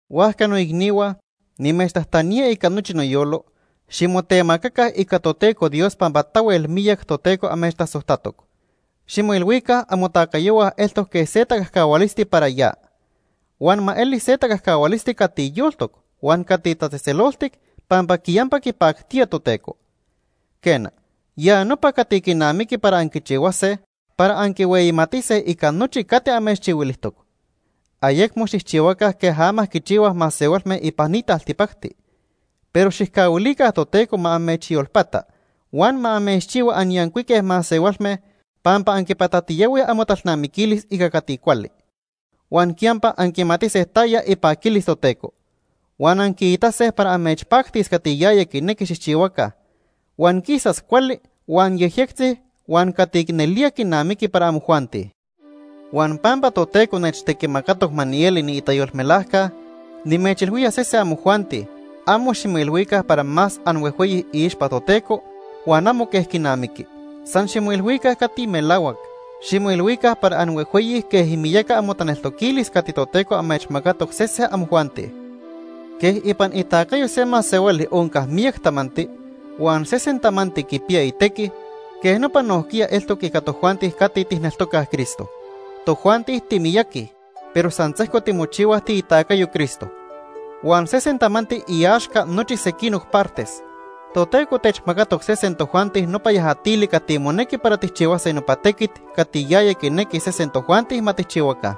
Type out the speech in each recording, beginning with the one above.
Huajca noicnihua, nimechtajtanía ica nochi noyolo, ximotemacaca ica Toteco Dios pampa tahuel miyac Toteco amechtasojtatoc. Ximoilhuica amotacayohua eltoc quej se tacajcahualisti para ya. Huan ma eli se tacajcahualisti cati yoltoc huan cati tatzejtzeloltic, pampa quiyampa quipactía Toteco. Quena, ya nopa cati quinamiqui para anquichihuase para anquihueyimatise ica nochi cati amechchihuilijtoc. Ayecmo xijchihuaca quej ama quichihuaj masehualme ipan ni taltipacti. Pero xijcahuilica Toteco ma amechyolpata huan ma amechchihua anyancuique masehualme pampa anquipatatiyahuij amotalnamiquilis ica cati cuali. Huan quiyampa anquimatise taya ipaquilis Toteco. Huan anquiitase para amechpactis cati yaya quinequi xijchihuaca, huan quisas cuali huan yejyectzi huan cati nelía quinamiqui para amojuanti. Huan pampa Toteco nechtequimacatoc ma nieli niitayolmelajca nimechilhuía sese amojuanti, amo ximoilhuica para más anhuejhueyi iixpa Toteco huan amo quej quinamiqui. San ximoilhuica cati melahuac. Ximoilhuica para anhuejhueyi quej imiyaca amotaneltoquilis cati Toteco amechmacatoc sese amojuanti. Quej ipan itacayo se masehuali onca miyac tamanti, huan sesen tamanti quipiya itequi, quej nopa nojquiya eltoc ica tojuanti cati tijneltocaj Cristo. Tojuanti timiyaqui, pero san sejco timochihuaj tiitacayo Cristo. Huan sesen tamanti iaxca nochi sequinoc partes. Toteco techmacatoc sesen tojuanti nopa yajatili cati monequi para tijchihuase nopa tequit cati yaya quinequi sesen tojuanti ma tijchihuaca.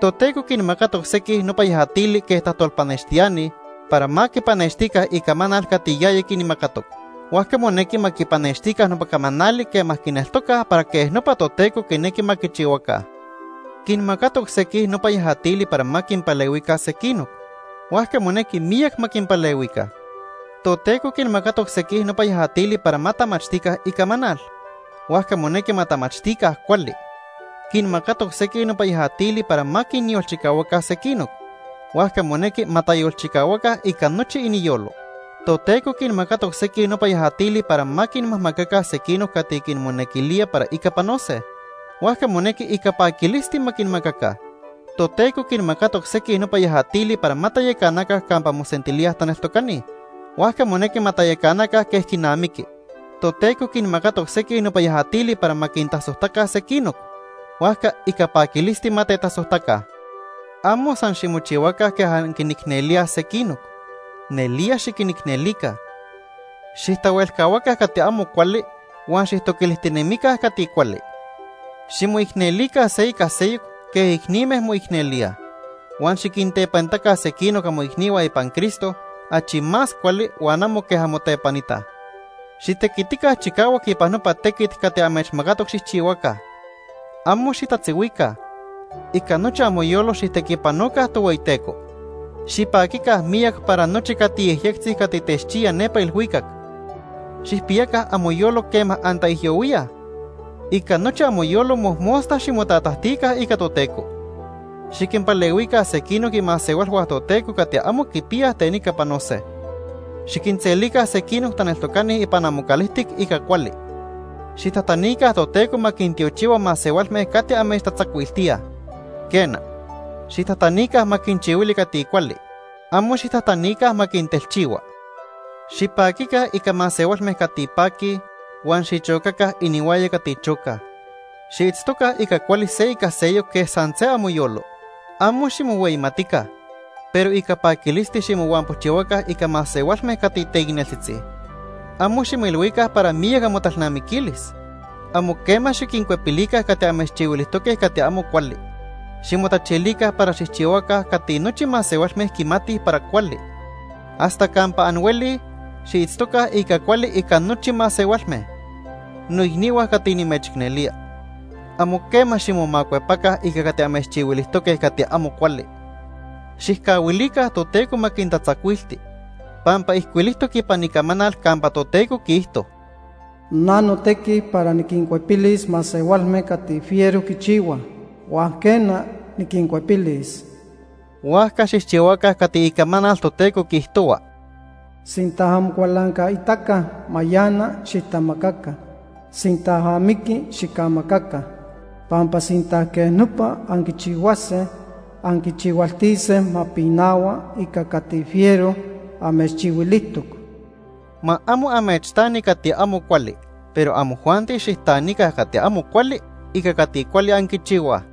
Toteco quinmacatoc sequij nopa yajatili quej tajtolpanextiani para ma quipanextica icamanal cati yaya quinmacatoc. Huajca monequi ma quipanextica nopa camanali quema quineltocaj para quej nopa Toteco quinequi ma quichihuaca. Quinmacatoc sequij nopa yajatili para ma quinpalehuica sequinoc, huajca monequi miyac ma quinpalehuica. Toteco quinmacatoc sequij nopa yajatili para ma tamachtica Icamanal, huajca monequi ma tamachtica cuali. Quinmacatoc sequij nopa yajatili para ma quinyolchicahuaca sequinoc, huajca monequi ma tayolchicahuaca ica nochi iniyolo. Toteco quinmacatoc sequij nopa yajatili para ma quinmajmacaca sequinoc cati quinmonequilía para ica panose, huajca monequi ica paquilisti ma quinmacaca. Toteco quinmacatoc sequij nopa yajatili para ma tayacanaca campa mosentilíaj taneltocani, huajca monequi ma tayacanaca quej quinamiqui. Toteco quinmacatoc sequij nopa yajatili para ma quintasojtaca sequinoc, huajca ica paquilisti ma tetasojtaca. Amo san ximochihuaca quej anquinicnelíaj sequinoc, nelía xiquinicnelica. Xijtahuelcahuaca cati amo cuali huan xijtoquilijtinemica cati cuali. Ximoicnelica se ica seyoc quej icnime moicnelíaj. Huan xiquintepanitaca sequinoc amoicnihua ipan Cristo achi más cuali huan amo quej anmotepanitaj. Xitequitica chicahuac ipan nopa tequit cati amechmacatoc xijchihuaca. Amo xitatzihuica. Ica nochi amoyolo xijtequipanoca Tohueyiteco. Xipaquica miyac para nochi cati yejyectzi cati techchiya nepa ilhuicac. Xijpiyaca amoyolo quema antaijyohuíaj. Ica nochi amoyolo mojmosta ximotatajtica ica Toteco. Xiquinpalehuica sequinoc imasehualhua Toteco cati amo quipiyaj ten ica panose. Xiquinselica sequinoc taneltocani ipan amocalijtic ica cuali. Xijtajtanica Toteco ma quintiochihua masehualme cati amechtatzacuiltíaj. Quena, xijtajtanica ma quinchihuili cati cuali, amo xijtajtanica ma quintelchihua. Xipaquica ica masehualme cati paquij, huan xichocaca inihuaya cati chocaj. Xiitztoca ica cuali se ica seyoc quej san se amoyolo. Amo ximohueyimatica, pero ica paquilisti ximohuampojchihuaca ica masehualme cati teicneltzitzi. Amo ximoilhuica para miyac amotalnamiquilis. Amo quema xiquincuepilica cati amechchihuilijtoque cati amo cuali. Ximotachilica para xijchihuaca cati nochi masehualme quimatij para cuali. Hasta campa anhuelij, xiitztoca ica cuali ica nochi masehualme. Noicnihua cati nimechicnelía. Amo quema ximomacuepaca ica cati amechchihuilijtoque cati amo cuali. Xijcahuilica Toteco ma quintatzacuilti. Pampa ijcuilijtoc ipan Icamanal campa Toteco quiijto: “Na notequi para niquincuepilis masehualme cati fiero quichihuaj, huan quena, niquincuepilis.” Huajca xijchihuaca cati Icamanal Toteco quiijtohua: “Sinta amocualancaitaca mayana, xijtamacaca. Sinta amiqui, xicamacaca. Pampa sinta quej nopa anquichihuase, anquichihualtise ma pinahua ica cati fiero amechchihuilijtoc.” Ma amo amechtani cati amo cuali. Pero amojuanti xijtanica cati amo cuali ica cati cuali anquichihuaj.